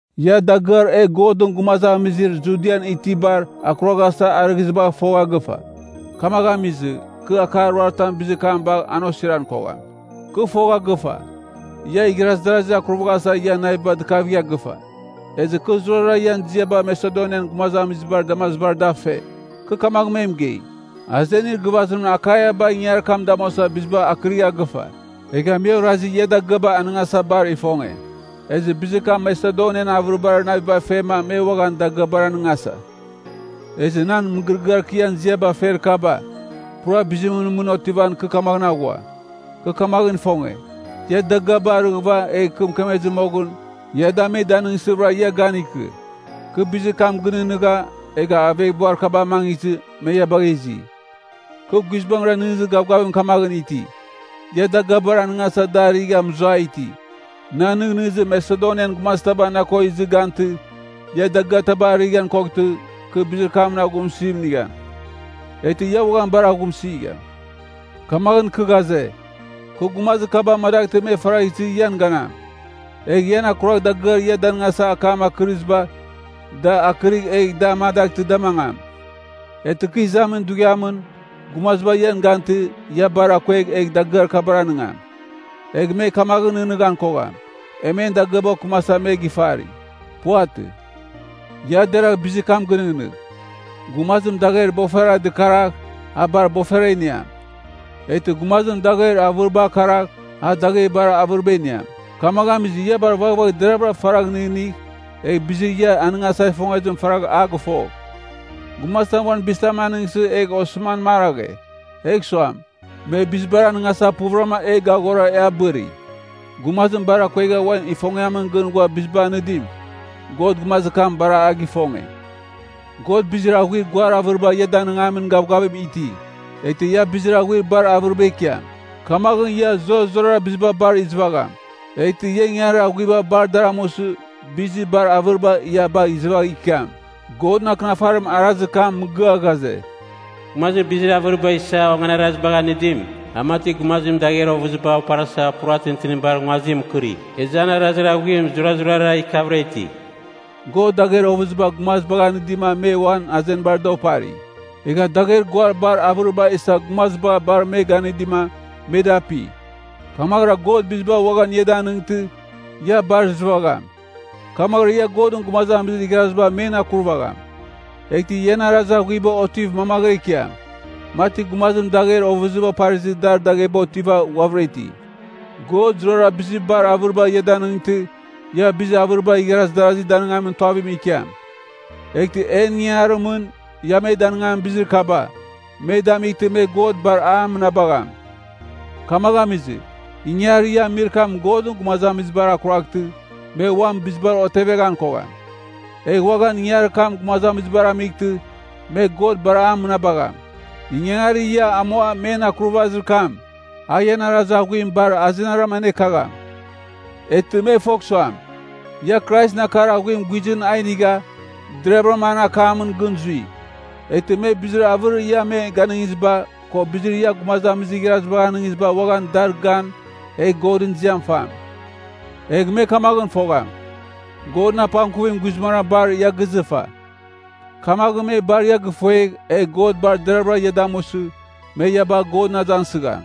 Ia dagɨar e Godɨn gumazamizir Judian itibar akuraghasa arɨghɨzibagh fogha gɨfa. Kamaghɨn amizɨ, kɨ akar ruaritam bizir kam bagh an osiran kogham. Kɨ fogha gɨfa, ia igharaz darazir akurvaghasa ian naviba dikavigha gɨfa. Ezɨ kɨ zurazurara ian ziaba Masedonian gumazamizibar damazibar da fe. Kɨ kamagh me mɨgei, “Azenir gɨvazim Akaiaba ingangarir kam damuasa biziba akɨrigha gɨfa.” Egha me orazi ia dagɨaba anɨngasa bar ifonge, ezɨ bizir kam Masedonian avɨribar naviba fema me uaghan dagɨabar anɨngasa. Ezɨ nan mɨgɨrɨgɨar kɨ ian ziaba fer kaba, pura bizimɨn mɨn otivan, kɨ kamaghɨn aghua. Kɨ kamaghɨn ifonge, ia dagɨaba arighɨva, egh kɨ mɨkemezɨ moghɨn, ia da me danɨngsɨvɨra ia gan ikɨ. Kɨ bizir kam gɨnɨghnɨgha, egha aveghbuar kaba amangizɨ, me ia bagha izi. Kɨ guizbangɨra nɨghnɨzir gavgavim kamaghɨn iti, ia dagɨabar anɨngasa da arigha mɨzuai iti. Nan nɨghnɨzim Masedonian gumazitaba na ko izɨ gantɨ, ia dagɨaba arighan koghtɨ, kɨ bizir kamɨn aghumsɨzim inigham. Eghtɨ ia uaghan bar aghumsigham. Kamaghɨn kɨ ghaze, kɨ gumazir kaba amadaghtɨ me faragh izɨ ian ganam, egh ian akuragh dagɨar ia danɨngasa akam akɨrɨziba, da akɨrigh egh da amadaghtɨ da mangam. Eghtɨ kɨ izamin dughiamɨn, gumaziba ian gantɨ, ia bar akuegh egh dagɨar kabar anɨngam. Egh me kamaghɨn nɨghnɨghan kogham, e men dagɨaba okɨmasa me gifari. Puvatɨ. Ia deragh bizir kam gɨnɨghnɨgh. Gumazim dagher bofera dɨkaragh, a bar bofera iniam. Eghtɨ gumazim dagher avɨribar karagh, a dagher bar avɨriba iniam. Kamagh amizɨ, ia bar vaghvagh deravɨra faragh nɨghnɨgh, egh bizir ia anɨngasa ifongezim faragha a gɨfogh. Gumazitam uan bizitam anɨngsɨ egh osɨman maraghe, egh suam, me bizibara anɨngasa puvɨrama e gaghora e abɨri. Gumazir bar akuegha uan ifongiamɨn gɨn ghua biziba anɨdim, God gumazir kam bar a gifonge. God bizir aghuir guar avɨriba ia danɨngamin gavgavim iti, eghtɨ ia bizir aghuir bar avɨriba ikiam. Kamaghɨn, ia zurazurara biziba bar izɨvagham. Eghtɨ ia ingangarir aghuiba bar dar amusɨ, bizir bar avɨriba ia bagh izɨvagh ikiam. Godɨn Akɨnafarim arazir kam mɨgɨa ghaze, “Gumazir bizir avɨriba isa onganarazibagh anɨdim, a mati gumazim dagher ovɨziba oparasa pura tintinibar nguazim mɨkɨri. Ezɨ an arazir aghuim zurazurara ikiavɨra iti.” God dagher ovɨziba gumazibagh anɨdima me uan azenibar da opari. Egha dagher guar bar avɨriba isa gumaziba bar me ganɨdima, me da api. Kamaghɨra God biziba uaghan ia danɨngtɨ, ia bar izɨvagham. Kamaghɨra ia Godɨn gumazamizir igharaziba men akurvagham. Eghtɨ ian arazir aghuiba otiv mangvɨra ikiam, mati gumazim dagher ovɨziba oparizɨ dar dagheba otiva ghuavɨra iti. God zurara bizir bar avɨriba ia danɨngtɨ, ia bizir avɨriba igharaz darazi danɨngamin tuavim ikiam. Eghtɨ en ingangarimɨn, ia me danɨngamin bizir kaba, me damightɨ, me God bar a mɨnabagham. Kamagh amizɨ, ingangarir ia amir kam Godɨn gumazamizibar akuraghtɨ, me uam bizibar oteveghan kogham. Egh uaghan ingangarir kam gumazamizibar amightɨ, me God bar a mɨnabagham. Ingangarir ia amua men akurvazir kam, a ian arazir aghuim bar azenaram anekagham. Eghtɨ me fogh suam, ia Kraisɨn akar aghuim guizɨn a inigha, deraghavɨra an akamɨn gɨn zui. Eghtɨ me bizir avɨrir ia me ganɨngiziba, ko bizir ia gumazamizir igharazibagh anɨngiziba uaghan dar gan, egh Godɨn ziam fam. Egh me kamaghɨn fogham, Godɨn apangkuvim guizbangɨra bar ia gizɨfa. Kamaghɨn, me bar ia gifuegh, egh God bar deravɨra ia damusɨ, me ia bagh Godɨn azangsɨgham.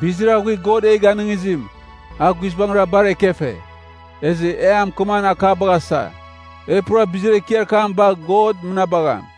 Bizir aghuir God e ganɨngizim, a guizbangɨra bar ekefe, ezɨ e a mɨkɨmamin akabagh asa. E pura bizir ekiar kam bagh God mɨnabagham!